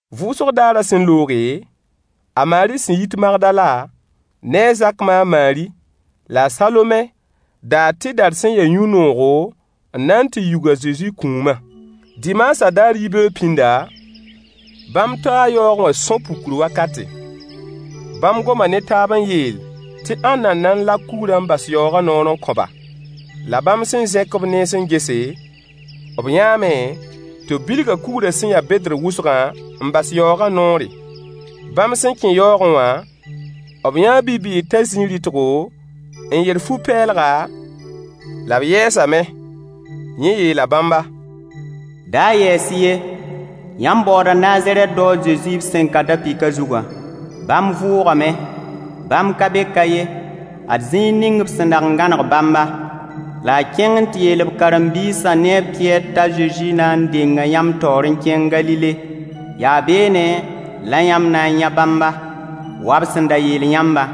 Vʋʋsg daarã sẽn looge, a Maari sẽn yit Magdala ne a Zak ma a Maari la a Salome daa tɩdar sẽn ya yũ-noogo n na n tɩ yug a Zezi kũumã. Dimaasã daar yibeoog pĩnda, bãmb taa yaoogẽ wã sõ-pukr wakate. Bãmb goma ne taab n yeel tɩ ãnna n na n lak kugrã n bas yaoogã noor n kõ-ba. La bãmb sẽn zẽk b nens n gese, b yãame tɩ b bilga kugrã sẽn ya bedr wʋsgã n bas yaoogã noore. Bãmb sẽn kẽ yaoogẽ wã, b yãa bi-bɩɩg t'a zĩ rɩtgo n yer fu-pɛɛlga, la b yɛɛsame. Yẽ yeela bãmba: Da yɛɛs-y ye. Yãmb baooda Nazarɛt dao a Zezi b sẽn ka da-pɩkã zugã. Bãmb vʋʋgame. Bãmb ka be ka ye. Ad zĩig ning b sẽn dag n gãneg bãmbã. La y kẽng n tɩ yeel b karen-biisã ne a Pɩyɛɛr t'a Zezi na n denga yãmb taoor n kẽng Galile. Yaa beene la yãmb na n yã bãmba wa b sẽn da yeel yãmbã.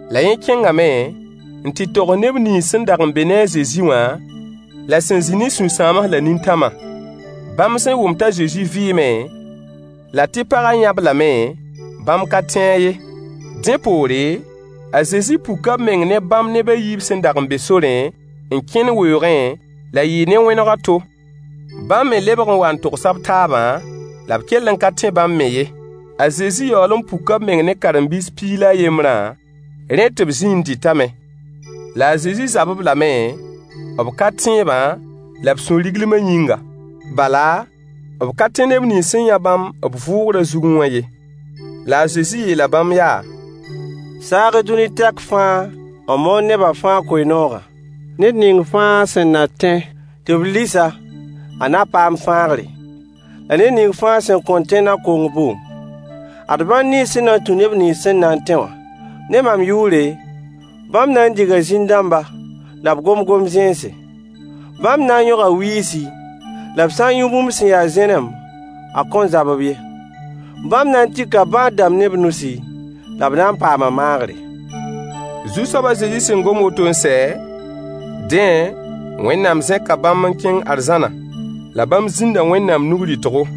La yẽ kẽngame n tɩ togs neb nins sẽn dag n be ne a Zezi wã la sẽn zĩ ne sũ-sãams la nintãmã. Bãmb sẽn wʋm t'a Zezi vɩɩme, la tɩ pagã yã-b lame, bãmb ka tẽ-a ye. Dẽ poore, a Zezi puka b meng ne bãmb neb a yiib sẽn dag n be sorẽ n kẽnd weoogẽ, la yɩɩ ne wẽneg a to. Bãmb me lebg n waa n togsa b taabã, la b kell n ka tẽ bãmb me ye. A Zezi yaool n puka b meng ne karen-biis piig la a yembrã, dẽ tɩ b zĩ n dɩtame. La a Zezi zab-b lame, b ka-tẽebã la b sũ-riglmã yĩnga. Bala, b ka tẽ neb nins sẽn yã bãmb b vʋʋgrã zugẽ wã ye. La a Zezi yeela bãmb yaa: Saag-y dũni tɛk fãa n moon neba fãa koe-noogã. Ned ning fãa sẽn na tẽ, tɩ b lis-a, a na paam fãagre. La ned ning fãa sẽn kõn tẽ na kong bʋʋm. Ad bãn nins sẽn na n tũ neb nins sẽn na n tẽ wã: ne mam yʋʋre, bãmb na n diga zĩn-dãmba la b gom gom-zẽnse. Bãmb na n yõga wiisi, la b sã n yũ bũmb sẽn ya zẽnem, a kõn zab-b ye. Bãmb na n tika bãad-rãmb ne b nusi, la b na n paama maagre. Zu-soab a Zezi sẽn gom woto n sɛ, dẽ Wẽnnaam zẽka bãmb n kẽng arzãna, la bãmb zĩnda Wẽnnaam nug rɩtgo.